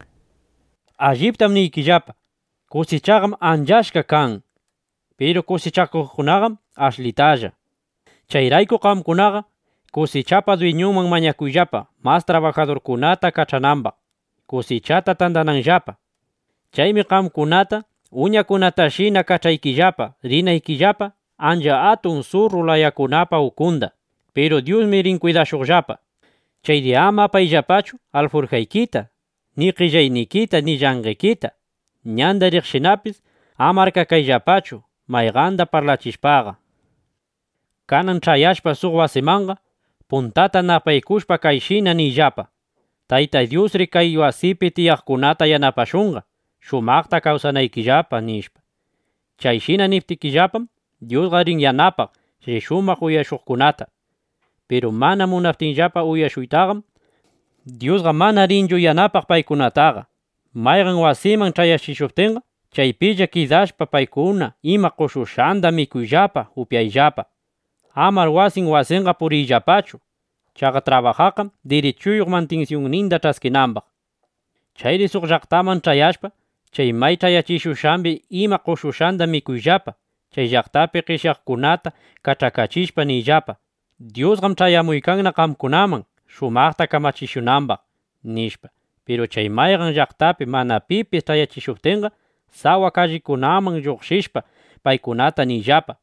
Chaymi paykunata nirqan: —Alliptam niykillapa, kusichaqam ancha achka kan. Piru kusichakuqkunaqam ashlitalla. Chayrayku qamkunaqa kusichapa dwiñunman mañakuyllapa, mas trabajadurkunata kach'anambaq, kusichata tandananllapa. Chaymi qamkunata uñakunatashina kach'aykillapa, rinaykillapa ancha atun surru layakunapa ukunda. (Piru Dyusmi rin kwidashuqllapa.) Chayri ama apayllapachu alfurjaykita ni qellaynikita ni llanqekita. Ñanda riqshinapis ama arkakayllapachu mayqanda parlachishpaqa. Kanan ch'ayashpa suq wasimanqa, puntata napaykushpa kayshina niyllapa: “Tayta Dyusri kay wasipi tiyaqkunata yanapashunqa, shumaqta kawsanaykillapa”, nishpa. Chayshina niptikillapam, Dyusqa rin yanapaq chay shumaq uyashuqkunata. Piru mana munaptinllapa uyashuytaqam, Dyusqa mana rinchu yanapaq paykunataqa. Mayqan wasiman ch'ayachishuptinqa, chaypilla kidashpa, paykuna ima qoshushqanda mikuyllapa, upyayllapa. Amar wasin wasinqa puriyllapachu. Chaqa trabajaqqam dirichuyuq mantinsyunninda ch'askinambaq. Chayri suq llaqtaman ch'ayashpa, chay may ch'ayachishushqambi ima qoshushqanda mikuyllapa. Chay llaqtapi qeshyaqkunata kach'akachishpa, niyllapa: “Dyusqam ch'ayamuykanna qamkunaman, shumaqta kamachikunambaq”, nishpa. Piru chay mayqan llaqtapi mana pipis ch'ayachishuptinqa, sawa kallingunaman lluqshishpa, paykunata niyllapa: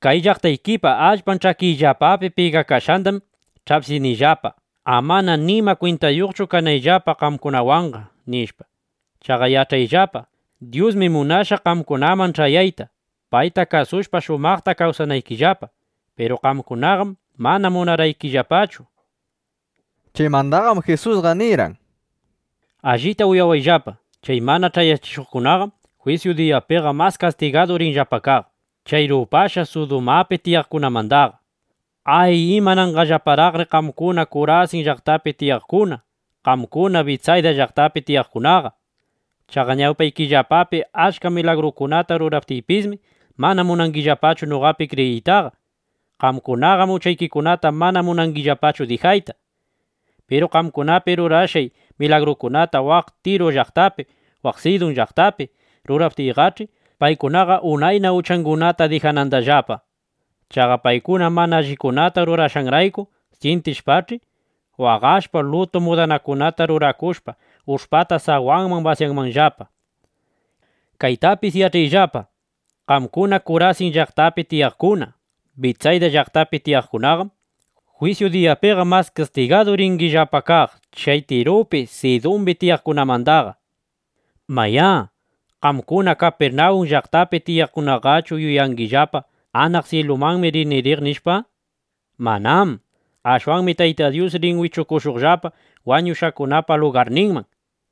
“Kay llaqtaykipa allpan ch'akiyllapapi pigakashqandam ch'apsinillapa, amana nima kwintayuqchu kanayllapa qamkunawanqa, nishpa. Chaqa yach'ayllapa, Dyusmi munashqa qamkunaman ch'ayayta, payta kasushpa, shumaqta kawsanaykillapa. (Piru qamkunaqam mana munarqaykillapachu)” nishpa. Chaymandaqam Jisusqa nirqan: —Allita uyawayllapa, chay mana ch'ayachishuqkunaqam jwisyu diyapiqa mas kastigadu rinllapa kaq chay rupashqa Sudumapi tiyaqkunamandaqa. ’¡Ay, imanangillaparaqri qamkuna Kurasin llaqtapi tiyaqkuna, qamkuna Bitsayda llaqtapi tiyaqkunaqa! Chaqa ñawpaykillapapi achka milagrukunata ruraptiypismi, mana munangillapachu noqapi kriyiytaqa. Qamkunaqam uchaykikunata mana munangillapachu dijayta. Piru qamkunapi rurashqay milagrukunata waq Tiru llaqtapi, waq Sidun llaqtapi ruraptiyqach'i, paykunaqa unayna uchangunata dijanandallapa. Chaqa paykuna mana allikunata rurashqanrayku syintishpach'i, waqashpa, lutu mudanakunata rurakushpa, ush'pata sawanman basyanandallapa. Kaytapis yach'ayllapa, qamkuna Kurasin llaqtapi tiyaqkuna, Bitsayda llaqtapi tiyaqkunaqam, jwisyu diyapiqa mas kastigadu ringillapa kaq chay Tirupi, Sidumbi tiyaqkunamandaqa. Mayá, ¿qamkuna Kapirnawun llaqtapi tiyaqkunaqachu yuyangillapa: Anaq syilumanmi rini riq, nishpa? ¡Manám! Ashwanmi Tayta Dyus rin wichukushuqllapa wañushqakunapa lugarninman.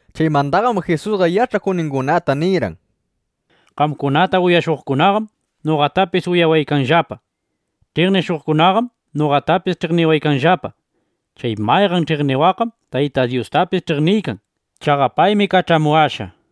Chaymandaqam Jisusqa yach'akuqningunata nirqan: —Qamkunata uyashuqkunaqam noqatapis uyawaykanllapa. Ch'iqnishuqkunaqam noqatapis ch'iqniwaykanllapa. Chay mayqan ch'iqniwaqqam Taytay Dyustapis ch'iqniykan. Chaqa paymi kach'amuwashqa, nishpa.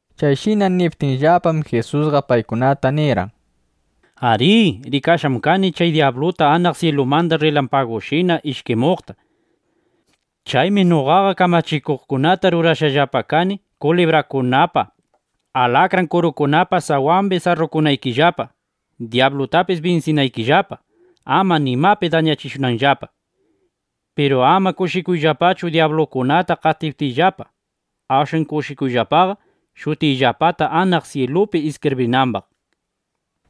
Chayshina niptinllapam, Jisusqa paykunata nirqan: —Arí, rikashqam kani chay dyabluta anaq syilumanda rrilampagushina ishkimuqta. Chaymi noqaqa kamachikuqkunata rurashushqallapa kani, kulibrakunapa, atallkikunapa (alakran kurukunapa) sawambi sarrukunaykillapa, dyablutapis binsinaykillapa, ama nimapi dañachishunanllapa. Piru ama kushikuyllapachu dyablukunata qatiptikillapa. Ashwan kushikuyllapaqa shutikillapata anaq syilupi iskibrishqambaq.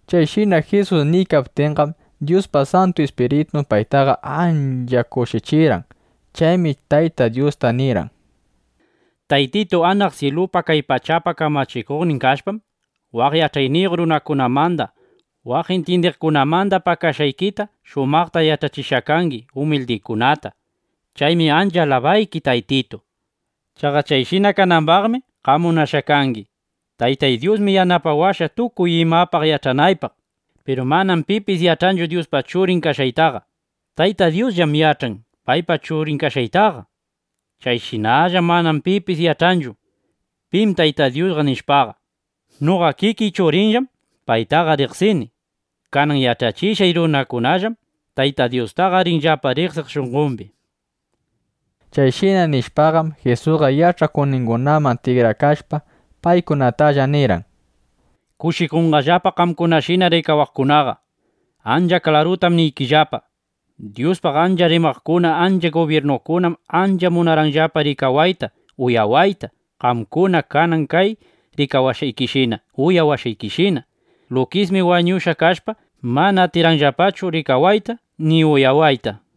Chayshina Jisus niykaptinqam, Dyuspa Santu Ispiritun paytaqa ancha kushichirqan. Chaymi Tayta Dyusta nirqan: —Taytitu, anaq syilupa, kay pachapa kamachikuqnin kashpam, waq yach'ayniyuq runakunamanda, waq intyindiqkunamanda pakashqaykita shumaqta yach'achishqa kangi umildikunata. Chaymi ancha alabayki, Taytitu. Chaqa chayshina kanambaqmi qam munashqa kangi. ’Taytay Dyusmi yanapawashqa, tukuy imapaq yach'anaypaq. Piru manam pipis yach'anchu Dyuspa Churin kashqaytaqa. Taytay Dyusllam yach'an paypa Churin kashqaytaqa. Chayshinallam mana pipis yach'anchu: Pim Tayta Dyusqa, nishpaqa. Noqa kikiy Churinllam paytaqa riqsini. Kanan yach'achishqay runakunallam Taytay Dyustaqa rinllapa riqsiq shunqombi. Chayshina nishpaqam, Jisusqa yach'akuqningunaman tikrakashpa, paykunatalla nirqan: —Kushikunqallapa qamkunashina rikawaqkunaqa. Ancha klarutam niykillapa, Dyuspaq achka rimaqkuna, achka gubyirnukunam ancha munarqanllapa rikawayta, uyawayta, qamkuna kanan kay rikawashqaykishina, uyawashqaykishina. Lukismi (wañushqana kashpa) mana atirqanllapachu rikawayta ni uyawayta, nishpa.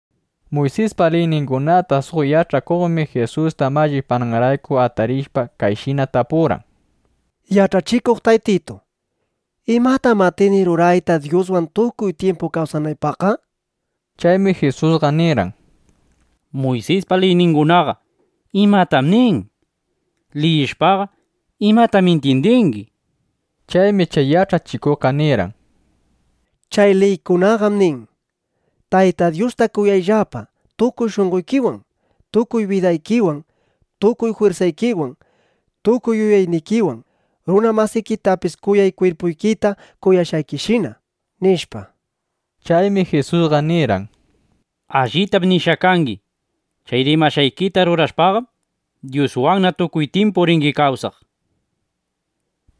Muysispa liyningunata suq yach'achikuqmi Jisusta mallipananrayku atarishpa, kayshina tapurqan: —Yach'achikuq Taytitu, ¿imatam atini rurayta, Dyuswan tukuy tyimpu kawsanaypaqqa? nishpa. Chaymi Jisusqa nirqan: —Muysispa liyningunaqa ¿imatam nin? Liyishpaqa, ¿imatam intyindingi? nishpa. Chaymi chay yach'achikuqqa nirqan: —Chay liykunaqam nin: “Tayta Dyusta kuyayllapa tukuy shunqoykiwan, tukuy bidaykiwan, tukuy jwirsaykiwan, tukuy yuyaynikiwan. Runa masikitapis kuyay, kwirpuykita kuyashqaykishina”, nishpa. Chaymi Jisusqa nirqan: —Allitam nishqa kangi. Chay rimashqaykita rurashpaqam, Dyuswanna tukuy tyimpu ringi kawsaq, nishpa.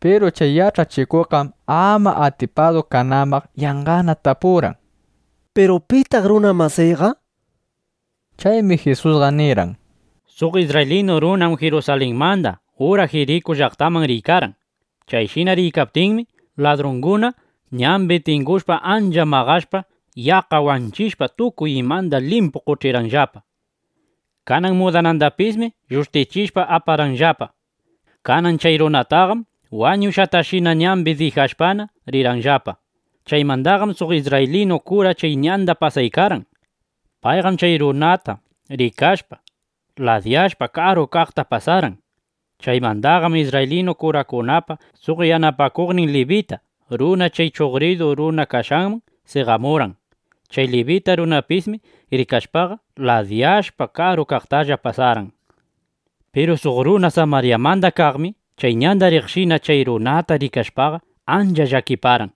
Piru chay yach'achikuqqam ama atipadu kanambaq, yanqana tapurqan: —¿Piru pitaq runa masiyqa? nishpa. Chaymi Jisusqa nirqan: —Suq isrraylinu runam Jirusalinmanda ura Jiriku llaqtaman riykarqan. Chayshina riykaptinmi, ladrunguna ñambi tingushpa, ancha maqashpa, yaqqa wanchishpa, tukuy imanda limpu qoch'irqanllapa. Kanan mudanandapismi llushtichishpa, aparqanllapa. Kanan chay runataqam wañushqatashina ñambi dijashpana, rirqanllapa. Chaymandaqam suq isrraylinu kura chay ñanda pasaykarqan. Payqam chay runata rikashpaqa, ladiyashpa, karu kaqta pasarqan. Chaymandaqam isrraylinu kurakunapa suq yanapakuqnin libita runa chay chuqridu runa kashqanman seqamurqan. Chay libita runapismi rikashpaqa, ladiyashpa, karu kaqtalla pasarqan. Piru suq runa Samaryamanda kaqmi chay ñanda riqshina chay runata rikashpaqa, ancha llakiparqan.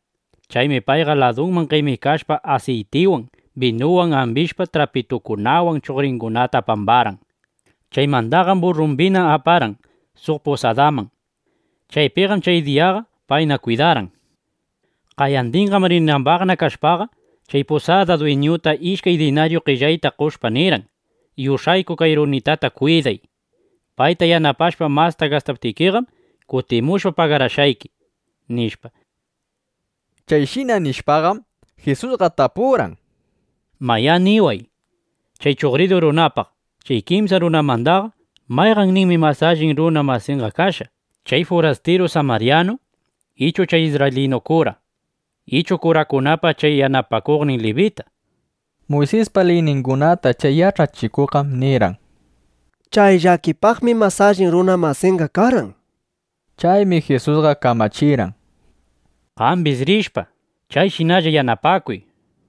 Chaymi paypa ladunman qemikashpa, asiytiwan, binuwan ambishpa, trapitukunawan chuqringunata pambarqan. Chaymandaqam burrumbina aparqan suq pusadaman. Chaypiqam chay diyaqa payna kwidarqan. Qayandinqam rinambaqna kashpaqa, chay pusada dwiñuta ishkay dinaryu qellayta qoshpa nirqan: “Yush'ayku kay runitata kwiday. Payta yanapashpa masta gastaptikiqam, kutimushpa pagarashqayki”, nishpa. Chayshina nishpaqam, Jisusqa tapurqan: —Mayá, niway, chay chuqridu runapaq, chay kimsa runamandaqa ¿mayqanninmi mas allin runa masinqa kashqa, (chay furastiru samaryanu ichu chay isrraylinu kura ichu kurakunapa chay yanapakuqnin libita)? nishpa. Muysispa liyningunata chay yach'achikuqqam nirqan: —Chay llakipaqmi mas allin runa masinqa karqan, nishpa. Chaymi Jisusqa kamachirqan: —Qambis rishpa, chayshinalla yanapakuy, nishpa.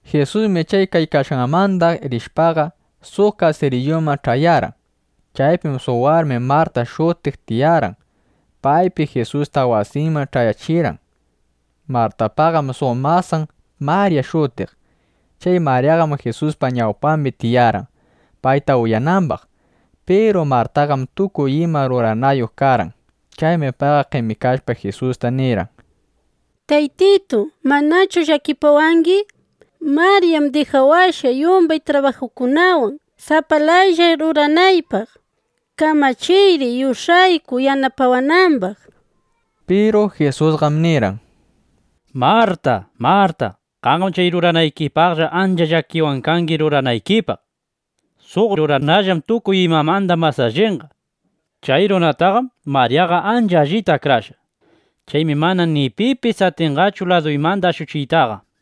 Jisusmi chay kaykashqanmanda rishpaqa, suq kasiriyuman ch'ayarqan. Chaypim suq warmi Marta shutiq tiyarqan. Paymi Jisusta wasinman ch'ayachirqan. Martapaqam suq masan (panin) Marya shutiq. Chay Maryaqam Jisuspa ñawpambi tiyarqan, payta uyanambaq. Piru Martaqam tukuy ima ruranayuq karqan. Chaymi payqa qemikashpa, Jisusta nirqan: —Taytitu, ¿manachu llakipawangi? Maryam dijawashqa yumbay trabajukunawan, sapalaylla ruranaypaq. Kamachiyri yush'ayku, yanapawanambaq, nishpa. Piru Jisusqam nirqan: —Marta, Marta, qamqam chay ruranaykipaqlla ancha llakiwan kangi ruranaykipaq. Suq ruranallam tukuy imamanda mas allinqa. Chay ruranataqam Maryaqa ancha allita akrashqa. Chaymi mana ni pipis atinqachu laduymanda ashuchiytaqa, nishpa.